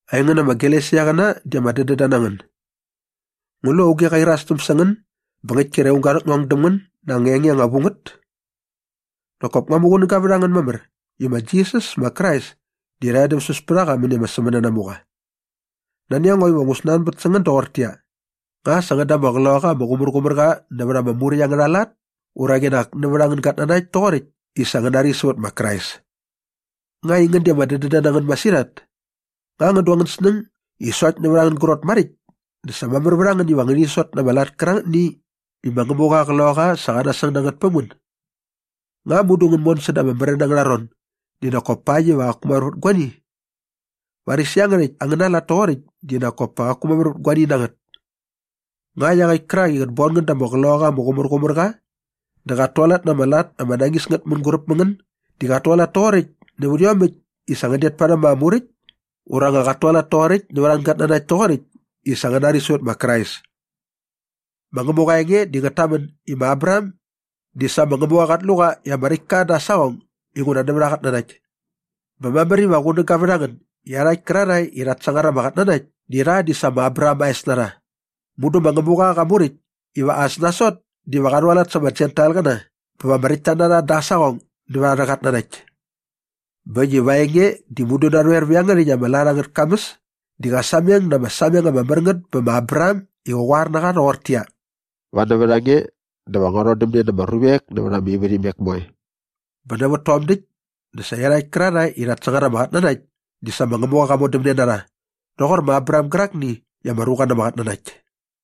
Aingän ama Galesiaqäna di ama dädända na ngän. Ngu lu auge qa irastäm sä ngän bä ngäkt kre aung ga rhäkngong däm ngän na anga enge anga vu ngät? Nak kop ngua muqunäga vät a ngän mamär i ma Jisas ma Krais di rha edämsäs pät a qa mäni ama sämänanamuqa. Nani a ngo iva ngu snanbät sä ngän doqortäqyia, “Nga sa ngän da ama Qloqaqa ama Qumärqumärqa nävät ama Muräkt angärha lat ura qinak nävät angän gatnanakt toqoräkt i sa ngän nari sävät ma Krais?” Nga aingän di ama dädända na ngän masirhat? Nga ngän du angän snäng i sokt nävät angän grot maräkt dä sa mamär vät a ngän iva ngäni sot na ama lat kärangätni i ma Ngämuqa aa Qloqaqa sa qa nasäng na ngät päm ngän? Nga mudu ngän mon säda ama märän angärha ron di nak kop pakt iva qaku mamär vät guani? Varis iangärhäkt angäna lat toqoräkt di nak kop pa qaku mamär vät guani na ngät. Nga iaqäkt kärak i qät bon ngän da ama Qloqaqa ama Qumärqumärqa dä qat tualat na ama lat ama nañis ngät mänguräp mä ngän di qat tualat toqoräkt nävät iomäkt i sa ngän det parhäm ama Muräkt ura nga qat tualat toqoräkt nävät angän gatnanakt toqoräkt i sa ngän nari sävät ma Krais? Ma Ngämuqa aa enge di ngät tamän i ma Abraham di sa ma Ngämuqa qat lu qa i ama räkt ka da aa saqong inguna nävät aa qatnanakt. Bä mamär iva qunäga vät a ngän i iarhakt kärarhae i rhat sangar ama qatnanakt di rha di sa ma Abraham aa es na rha. Mudu ma Ngämuqa qa muräkt iva as nasot diva qa rhualat sa ama Jentailqäna bä va ama räktta na rha da aa saqong nävät arhä qatnanakt. Bä äkt i va aa enge di mudu narhoer vä iangärhäkt ama lat angät kamäs di qa sameng na ama sameng ama mär ngät bä ma Abraham i qa qoar na qa rhoqortäqyia, “Va nävät a nge dä va ngua rhodämne na ama ruvek nävät ama ivärhimek moe.” Bä nävät tom däkt dä sa iarhakt kärarhae i rhat sangar ama qatnanakt di sa ma Ngämuqa qa modämne na rha rhoqor ma Abraham gärakni i ama ruqa na ama qatnanakt.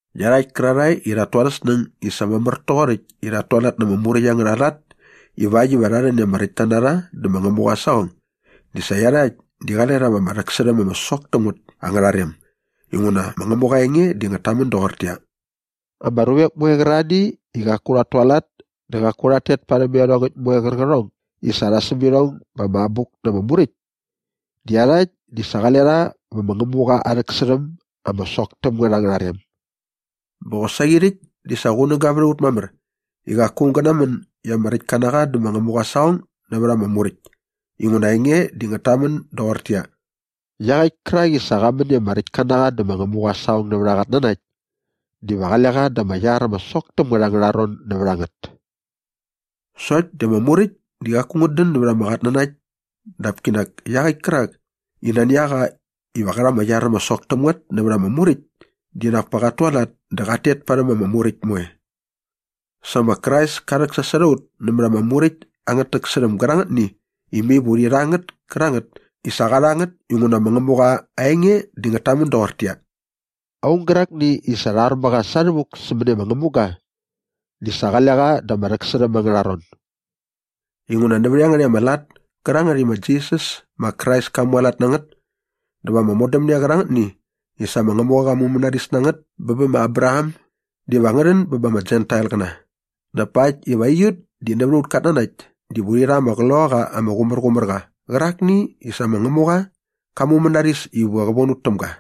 Iarhakt kärarhae i rhat tu arhä snäng i sa mamär toqoräkt i rhat tualat na ama Muräkt angärha lat ivakt iva rha rhän i ama räktta na rha dä ma Ngämuqa aa saqong di sa iarhakt di qale rha va ama rhäksärhäm ama sok täm ngät angärha rem inguna ma Ngämuqa aa enge di ngät tamän doqortäqyia, “Ama ruvek moe qärarhani i qaku rhat tualat dä qaku rhat tet parhäm iarhongäkt moe qärqärhong i sa rha säm irhong ba ama Abuk na ama Muräkt di iarhakt di sa qale rha vä ma Ngämuqa aa rhäksärhäm ama sok täm ngät angärha rem.” Bä qosaqi rhäkt di sa qunäga vät a ut mamär i qaku aung gä namän i ama räktka na qa dä ma Ngämuqa aa saqong nävät ama Muräkt inguna aa enge di ngät tamän doqortäqyia, “Iaqäkt kärak i sa qa män i ama räktka na qa dä ma Ngämuqa aa saqong nävät aa qatnanakt diva qale qa da ama iar ama sok täm ngät angärha ron nävät a ngät.” Sokt di ama Muräkt di qaku ngät dän nävät ama qatnanakt dap kinak iaqäkt kärak i nani a qa iva qä rha ama iar ama sok täm ngät nävät ama Muräkt dinak pa qat tualat dä qat tet parhäm ama Muräkt moe. Sa ma Krais ka rhäksasot a ut nämät ama Muräkt angät täksärhäm gärangätni i mai va urhi rha ngät kärangät i sa qa rha ngät inguna ma Ngämuqa aa enge di ngät tamän doqortäqyia, “Aung gärakni i sa rha ar mä qa sa rhävuk sämäni ama ngämuga di sa qale qa da ama rhäksärhäm angärha ron.” Inguna nävät iangärhäkt ama lat kärangät i ma Jisas ma Krais ka mualat na ngät dä va ama modämne qärangätni i sa ma Ngämuqa qa mumänaris na ngät bä ba ma Abraham diva ngä rhän bä ba ama Jentailqäna dap pakt iva aiut di nävät aut katnanakt diva urhi rha ama Qloqaqa ama Qumärqumärqa qärakni i sa ma Ngämuqa qa mumänaris iva qä von ut täm ga.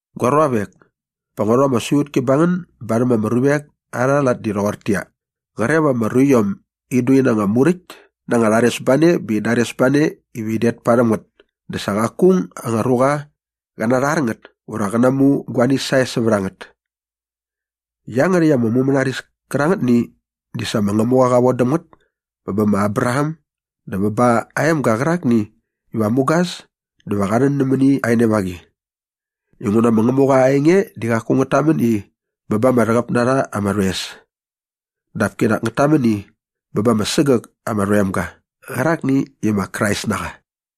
Gua ruavek, pa ngua rhu ama siqutki ba ngän barhäm ama ruvek arha lat di rhoqortäqyia, qre va ama ruiom in du ina anga muräkt na anga rharesbane bä in dares ba ne iva in det parhäm ngät dä sa qaku aung anga ruqa qä narhar ngät ura qä namu guani sae sävät a ngät. Iangärhäkt ama mumänaris kärangätni di sa ma Ngämuqa qa von däm ngät bä bä ma Abraham dä bä ba aa emga qärakni iva mugas dä va qa rhän nämäni aa enevaqi. Inguna ma Ngämuqa aa enge di qaku ngät tamän i, “bä ba ama rhäqäp na rha ama rhoes.” Dap kinak ngät tamän i, “bä ba ama sägäk ama rhoemga” qärakni i ma Krais na qa.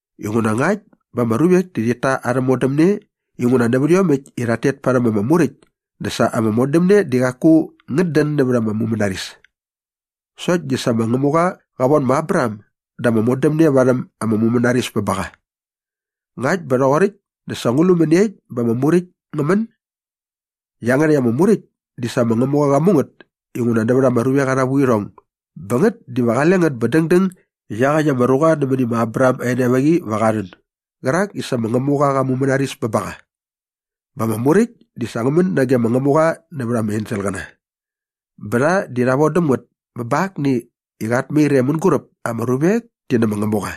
Inguna ngakt bä ama ruvek di rhit ta arhä modämne inguna nävät iomäkt i rhat tet parhäm ama Muräkt dä sa ama modämne di qaku ngät dän nävät ama mumänaris. Sokt di sa ma Ngämuqa qa von ma Abraham da ama modämne varhäm aa mumänaris bä ba qa. Ngakt bä rhoqoräkt dä sa ngu lu mäniekt bä ama Muräkt ngä män? Iangärhäkt ama Muräkt di sa ma Ngämuqa qa mu ngät inguna nävät ama ruvek arha vuirhong bä ngät diva qale ngät bä dängdäng i iaqäkt ama ruqa nämäni ma Abraham aa enevaqi va qa rhän gärak i sa ma Ngämuqa qa mumänaris bä ba qa. Bä ama Muräkt di sa ngä män nage ma Ngämuqa nävät ama enselqäna. Bä rha di rha von däm ngät bä bä akni i qat mair e mänguräp ama ruvek ti nä ma Ngämuqa.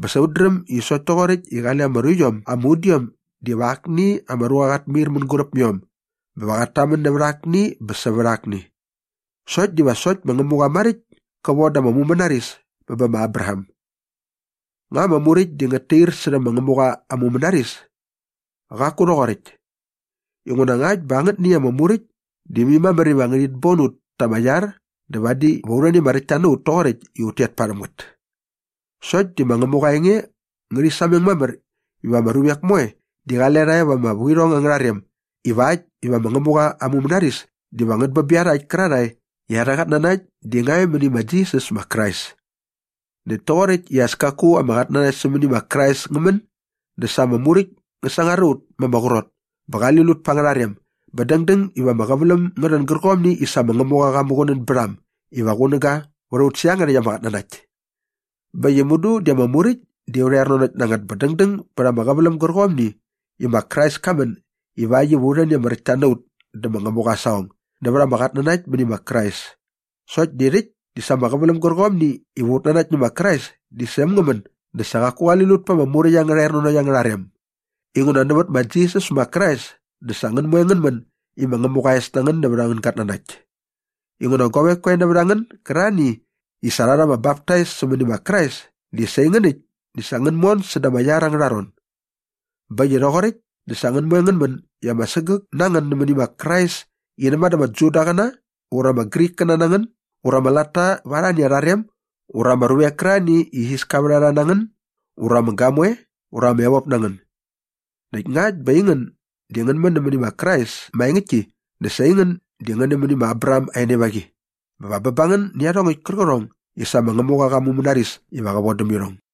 Bä sa ut dräm i sokt toqoräkt i qale ama ruiom ama udiom dä va akni ama ruqa qat mair mänguräp mä iom bä va qat tamän nävät akni bä sävät akni. Sokt diva sokt ma Ngämuqa maräkt ka von da ama mumänaris bä bä ma Abraham. Nga ama Muräkt di ngät tair särhä ma Ngämuqa aa mumänaris? Qaku rhoqoräkt. Inguna ngakt bä angätni ama muräkt di mai mamär iva ngärhit bon ut ta ama iar dä vadi va u rhän i ama räktta na ut toqoräkt i ut tet parhäm ngät. Sokt di ma Ngämuqa aa enge ngärhi sameng mamär i ama ruvek moe di qale rha e va ama vuirhong angärha rem ivakt iva ma Ngämuqa aa mumänaris diva ngät bä bä iarhakt kärarhae i arhä qatnanakt di nga e mäni ma Jisas ma Krais. Näkt toqoräkt i as kaku ama qatnanakt sämäni ma Krais ngä män dä sa ama Muräkt ngä sangar a ut ma ama qrot bä qali lut pa angärha rem bä dängdäng iva ama qäväläm ngä rhän gärqomni i sa ma Ngämuqa qa muqunän bät a äm iva qunäga vät ut sävät iangärhäkt ama qatnanakt. Bä äkt i mudu di ama Muräkt di aurha ernanokt na ngät bä dängdäng bät ama qäväläm gärqomni i ma Krais ka män ivakt iva u rhän i ama räktta na ut dä ma Ngämuqa aa saqong nävät ama qatnanakt mäni ma Krais. Sokt di rhäkt i sa ama qäväläm gärqomni iva ut nanakt nä ma Krais di sa äm ngä män dä sa qaku qali lut pa ama Muräkt angärha ernanokt angärha rem inguna nävät ma Jisas ma Krais dä sa ngän moe ngän män i Ngämuqa aa es na ngän nävät angän gatnanakt. Inguna guavek koe nävät a ngän gärarhani i sa rha rha ama baptais sämäni ma Krais di sa aingän äkt di sa ngän mon sädä aa iar ängärha ron. Bä äkt i rhoqoräkt dä sa ngän moe ngän män i ama sägäk na ngän mäni ma Krais i näma dä ama Judaqäna ura ama Grikkäna na ngän ura ama latta va arhani arha rem ura ama ruvek kärarhani i isiska vät a rha na ngän ura ama gamoe ura ama evop na ngän. Näkt ngakt bä aingän di ngän nämäni ma Krais maengäktki dä sa aingän di ngän nämäni ma Abraham aa enevaqi bä va bä ba ngän nä iarhongäkt kärqärhong i sa ma Ngämuqa qa mumänaris iva qä von däm irhong.